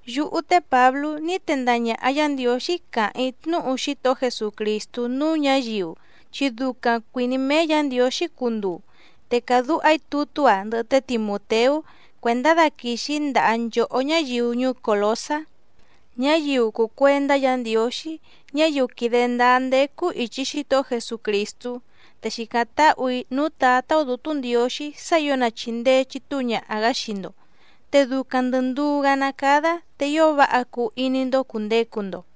Yúhú té Pǎblú ní tendaha ñàha Yá Ndiǒxí càháⁿ‑í tnúhu Xítohó Jesucrìstú núú ñǎyiu chi ducaⁿ cuìní méé Yǎ Ndiǒxí cunduu, te càdúha‑í tutú‑a ndɨhɨ té Timùteú cuèndá daquìxi‑í ndaha nchòhó ñáyiu ñuú Còlosá, ñáyiu cùu cuendá Yǎ Ndiǒxí, ñáyiu quìde ndáá ndécú ìchi Xítohó Jesucrìstú, te xìcáⁿ táhù‑í núú Tǎtá‑ó Dǔtú Ndiǒxí sá ǐo na chìndee chitúu ñaha‑gǎ xii‑ndo, te ducaⁿ ndɨ̀ nduú‑gá ná cádá te ío váha cuu iní‑ndó cùndecu‑ndo.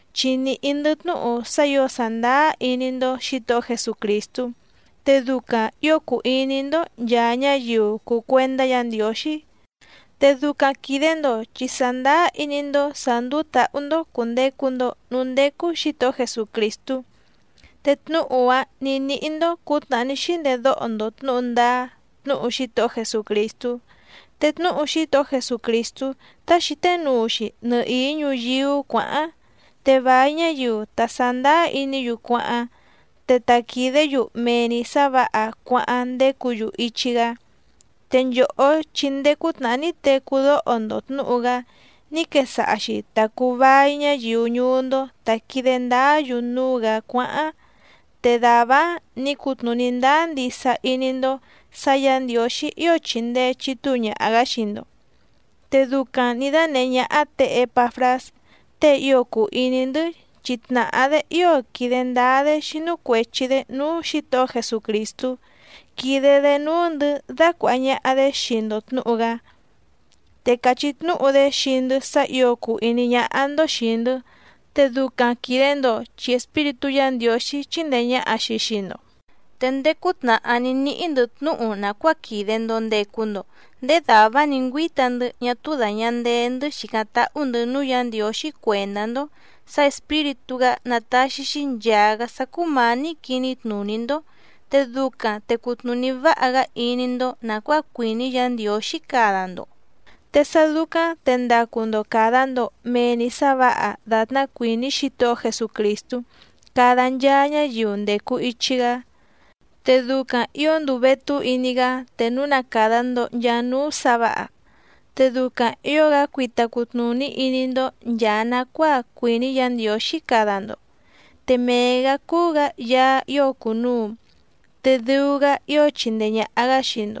chi nìhí‑ndɨ́ tnúhu sá ǐo sàndáá iní‑ndó Xǐtohó Jesucrìstú, te ducaⁿ ǐo cùu iní‑ndó nchàa ñáyiu cùu cuendá Yǎ Ndiǒxí. Te ducaⁿ quìde‑ndo chi sàndáá iní‑ndó sǎ ndúú tǎhú‑ndó cùndecu‑ndo núú ndécú Xǐtohó Jesucrìstú, te tnúhu‑áⁿ nǐ níhí‑ndó cǔtnàhá ní xíndedóho‑ndo tnǔhu ndáá tnúhu Xítohó Jesucrìstú. Te tnúhu Xítohó Jesucrìstú tá xǐté nuu‑xi nɨhìí ñuyíú cuǎháⁿ. Te vài ñáyiu ta sàndáá iní‑yu cuáháⁿ, te ta quìdé‑yu mee‑ni sǎ vǎha cuáháⁿ ndécǔ‑yu ichi‑gá. Te nchòhó chi ndéé cútnàhá ní tecú dóho‑ndo tnǔhu‑gá ní quesaha‑xi ta cùu vai ñáyiu ñuú‑ndó tá quìde ndáá‑yu núú‑gǎ cuáháⁿ. Te dàvá‑áⁿ nǐ cutnùní ndáá ndisa iní‑ndó sǎ Yǎ Ndiǒxí ío chìndee chitúu ñaha‑gá xii‑ndo. Te ducaⁿ nǐ dánèhé ñáhá tě Ěpafrás tée ío cùu iní‑ndɨ́, chi tnàhá‑dé ío quìde ndáá‑dé xínú cuèchi‑dé núú Xǐtohó Jesucrìstú quídé‑dě núú‑ndɨ̌ dácuàha ñaha‑dé xii‑ndo tnǔhu‑gá. Te càchí tnúhu‑dé xii‑ndɨ́ sá ǐo cùu iní ñáhá‑ndó xìi‑ndɨ́, te ducaⁿ quìde‑ndo chi Espíritú Yǎ Ndiǒxí chíndèe ñaha‑xi xii‑ndo. Te ndéé cútnàhá ní níhí‑ndɨ̌ tnúhu nàcuáa quìde‑ndo ndecu‑ndo ndéé dàvá‑áⁿ nǐ ngüíta‑ndɨ́ ñá túú dàña ndee‑ndɨ́ xìcáⁿ táhú‑ndɨ̌ núú Yǎ Ndiǒxí cuèndá‑ndó sǎ Espíritú‑gá ná tàxi‑xi nchaa‑gá sá cúmǎní quiní tnùní‑ndó, te ducaⁿ te cutnùní váha‑gá iní‑ndó nàcuáa cuìní Yǎ Ndiǒxí cada‑ndo. Te sá dúcáⁿ te ndacu‑ndo càda‑ndo mee‑ni sá vǎha dàtná cuìní Xítohó Jesucrìstú cada nchaa ñáyiu ndècu ichi‑gá. Te ducaⁿ ǐo nduu vétú iní‑gá te núu na càda‑ndo nchaa núú sǎ vǎha. Te ducaⁿ ǐo‑gá cuita cutnùní iní‑ndó nchàa nacuáa cuìní Yǎ Ndiǒxí cada‑ndo. Te mee‑gǎ cúú‑gǎ Yaá ío cùnuu, te dɨu‑gá ío chindee ñàha‑gá xii‑ndo,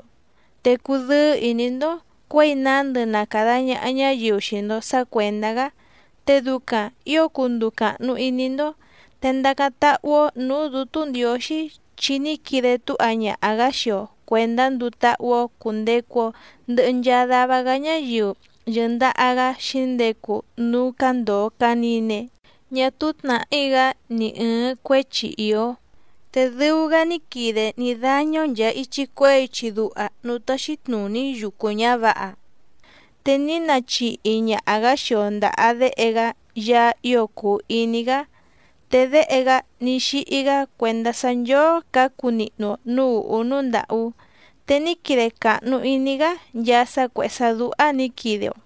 te cudɨ́ɨ́ ìní‑ndó cuěi nándɨ na càda ñaha ñáyiu xii‑ndo sǎ cuèndá‑gá, te ducaⁿ ǐo cunduu càhnu iní‑ndó. Te ndacáⁿ táhú‑ó nǔú Dǔtú Ndiǒxí chi ní quide túha ñaha‑gǎ xii‑o cuèndá nduu táhú‑ó cùndecu‑o ndɨhɨ nchaa dava‑gá ñáyiu yɨ̀ndaha‑gá xǐndecu núú cándòo canine ñá túú tnàhí‑gá ni ɨ̀ɨⁿ cuéchi ìó. Te dɨu‑gá ní quide ní dáñá‑ó nchàa ichi cuehé ichi duha núú táxí tnùní yucu ñǎvǎha, te ní nachihi ñaha‑gǎ xii‑o ndàha Déhe‑gá Yaá ío cùu iní‑gá. Te Déhe‑gá ní xíhí‑gá cuèndá sá nchóó cǎcu nihnu‑o nǔú ùhú núú ndàhú, te ní quide càhnu iní‑gá nchaa sá cuèhé sá dúhá nǐ quide‑o.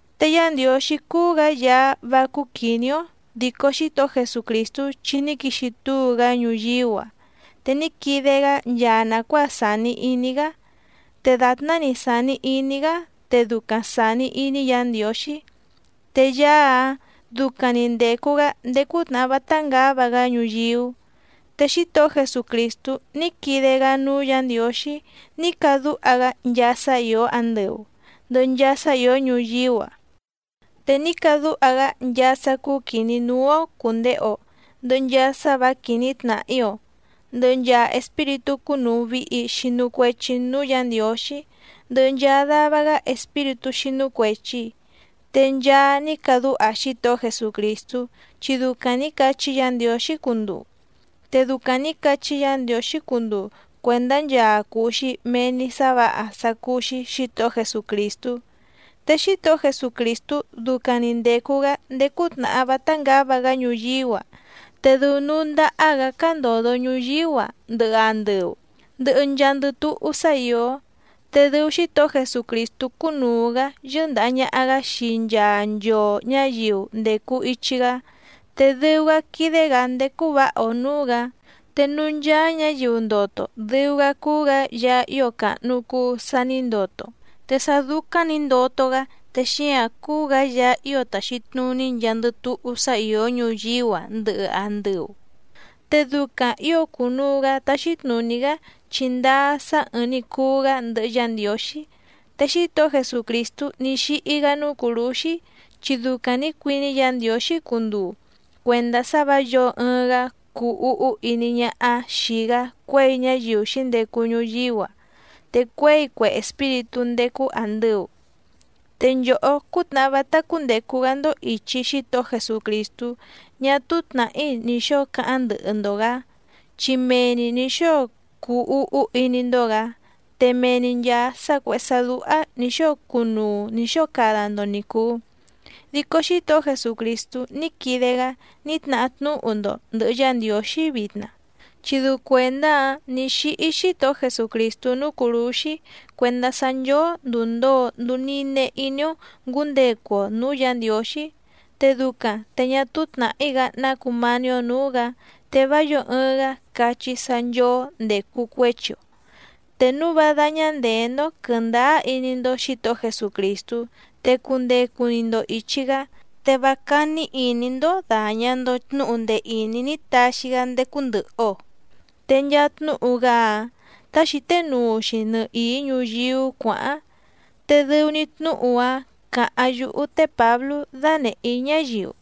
Te Yá Ndiǒxí cúú‑gǎ Yaá vá cúú quìní‑ó dico Xítohó Jesucrìstú chi ní quixi túu‑gá ñuyíú‑a, te ní quide‑gá nchaa nàcuáa sàni iní‑gá. Te dàtná‑ni sàni iní‑gá te ducaⁿ sàni iní Yǎ Ndiǒxí, te Yaá‑áⁿ ducaⁿ‑ni ndècu‑gá ndéé cútnàhá vátá ngǎva‑gá ñuyíú. Te Xítohó Jesucrìstú ní quide‑gá núú Yǎ Ndiǒxí ní cadúha‑gá nchaa sá ìó andɨu ndɨ̀hɨ nchaa sá ìó ñuyíú‑a, te ní cadúha‑gá nchaa sá cúú quìní núú‑ó cùndehe‑o, ndɨhɨ nchaa sá vǎ quìní tnàhí‑o, ndɨhɨ nchaa espíritú cúnùu vihi xinu cuechi núú Yǎ Ndiǒxí, ndɨhɨ nchaa dava‑gá espíritú xínú cuèchi. Te nchaa ní cadúha Xítohó Jesucrìstú chi ducaⁿ nǐ cachí Yǎ Ndiǒxí cunduu. Te ducaⁿ nǐ cachí Yǎ Ndiǒxí cunduu cuèndá nchaa cuu‑xi mee‑ni sǎ vǎha sá cúú‑xí Xǐtohó Jesucrìstú. Te Xítohó Jesucrìstú ducaⁿ‑ni ndècu‑gá ndéé cútnàhá vátá ngǎva‑gá ñuyíú‑a, te dɨu núú ndáhá‑gǎ cándòdo ñuyíú‑a, ndɨhɨ andɨu, ndɨhɨ nchaandɨ túhú sá ìó. Te dɨu Xítohó Jesucrìstú cúnùu‑gá yɨ́ndàha ñaha‑gá xii nchaa nchoo ñǎyiu ndècu ichi‑gá, te dɨu‑gá quídé‑gǎ ndécú vǎha‑o nǔú‑gǎ. Te núú ncháá ñǎyiu ndoto dɨu‑gá cúú‑gǎ Yaá ío càhnu cuu sa ní ndoto, te sá dúcáⁿ nǐ ndoto‑gá te xíǎⁿ cúú‑gǎ Yaá ío tàxi tnuní nchaandɨ túhú sá ìó ñuyíú‑a ndɨhɨ andɨu. Te ducaⁿ ǐo cùnuu‑gá táxí tnùní‑gá chi ndáá sá ɨ̀ɨⁿ‑ni cuu‑gá ndɨhɨ Yá Ndiǒxí. Te Xítohó Jesucrìstú ní xíhí‑gá núú cùrúxí, chi ducaⁿ nǐ cuiní Yǎ Ndiǒxí cunduu cuèndá sá vǎ yǒo ɨɨⁿ‑gá cuu úhú iní ñáhá xìi‑gá cuěi ñáyiu xǐndecu ñuyíú‑a, te cuěi cue espíritú ndécú àndɨu. Te nchòhó cútnàhá vátá cúndècu‑gá‑ndó ìchi Xítohó Jesucrìstú ñá túú tnàhí ni xǒo cáháⁿ ndɨhɨ‑ndo‑gǎ, chi mee‑ni nǐ xóo cuu úhú iní‑ndó‑gǎ, te mee‑ni nchàa sá cuèhé sá dúhá nǐ xóo cunuu nǐ xóo cada‑ndo ni cùu, dico Xítohó Jesucrìstú ní quide‑gá ní tnahá tnúhu‑ndo ndɨ̀hɨ Yá Ndiǒxí vitna. Chi dɨu cuèndá‑áⁿ nǐ xíhí Xítohó Jesucrìstú núú cùrúxí cuèndá sá nchóó ndùu ndoo nduu nine iní‑ó ngǔndecu‑o nǔú Yǎ Ndiǒxí, te ducaⁿ te ñá túú tnàhí‑gá ná cumání‑ó nǔú‑gǎ, te vá yǒo ɨɨⁿ‑gá cachí sá nchóó ndècu cuéchi‑o. Te núu vá dáñá ndèé‑ndó quɨ̀ndáá iní‑ndó Xǐtohó Jesucrìstú, te cundecu‑ni‑ndo ìchi‑gá, te vá cání ìní‑ndó dàña‑ndo tnúhu ndee ìní ní taxi‑gá ndécú ndɨ̀hɨ‑o. Te nchaa tnúhu‑gá‑áⁿ tá xǐté nuu‑xi nɨhìí ñuyíú cuǎháⁿ, te dɨu‑ni tnúhu‑áⁿ càháⁿ yúhú té Pǎblú dánèhé‑í ñáyiu.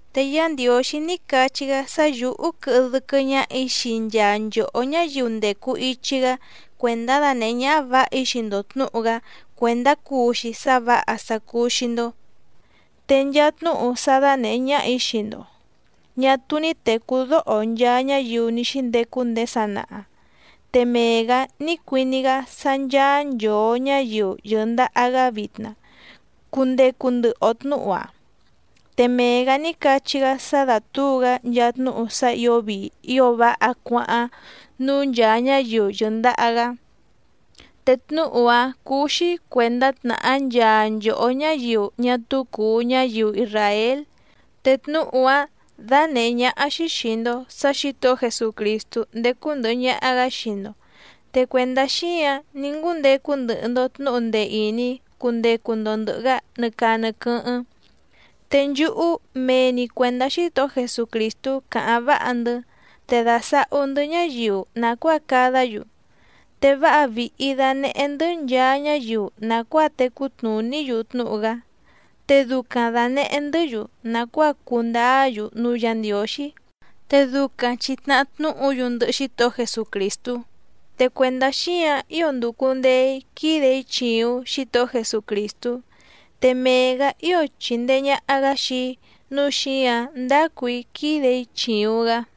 Te Yá Ndiǒxí ní cachí‑gá sá yǔhú quɨhɨ dɨ́quɨ́ ñáhà‑í xii nchaa nchòhó ñáyiu ndècu ichi‑gá cuèndá danèhé ñáhá vǎha‑í xii‑ndo tnǔhu‑gá cuèndá cuu‑xi sá vǎha sá cúú‑xí‑ndó. Te nchaa tnúhu sá dánèhé ñáhà‑í xii‑ndo ñà túú ní tècú dóho nchaa ñáyiu ní xíndecu ndéé sanaha, te mee‑gǎ ní cuiní‑gá sá ncháá nchòo ñáyiu yɨ̀ndaha‑gá vitna cundecu ndɨhɨ‑o tnǔhu‑áⁿ. Te mee‑gǎ ní cachí‑gá sá dátǔu‑gá nchaa tnúhu sá ǐo vii ío váha cuáháⁿ núú nchàa ñáyiu yɨ̀ndaha‑gá. Te tnúhu‑áⁿ cúú‑xí cuèndá tnàhá nchaa nchòhó ñáyiu ñá túú cùu ñáyiu isràél. Te tnúhu‑áⁿ dánèhé ñáhá‑xí xìi‑ndo sá Xǐtohó Jesucrìstú ndécú ndɨ̀hɨ ñaha‑gá xii‑ndo. Te cuèndá xíǎⁿ ní ngúndecu ndɨhɨ‑ndo tnǔhu ndee ìní cundecu‑ndo ndɨ̀hɨ‑gá nɨ caa nɨ quɨ́hɨ́ⁿ. Te nchúhú mee‑ni cuèndá Xítohó Jesucrìstú càháⁿ váha‑ndɨ́, te dàsahú‑ndɨ́ ñáyiu nàcuáa cadá‑yu. Te váha vìhi danehé‑ndɨ́ nchaa ñáyiu nàcuáa tecú tnùní‑yu tnúhu‑gá, te ducaⁿ dànehé‑ndɨ́‑yu nàcuáa cundáá‑yu núú Yǎ Ndiǒxí, te ducaⁿ chi tnàhá tnúhu‑yu ndɨhɨ Xítohó Jesucrìstú. Te cuèndá xíǎⁿ ío ndùcu ndee‑í quídè‑í chìuⁿ Xítohó Jesucrìstú, te mee‑gǎ ío chìndee ñaha‑gá xii‑í nǔu xíǎⁿ ndácù‑í quídè‑í chìuⁿ‑gá.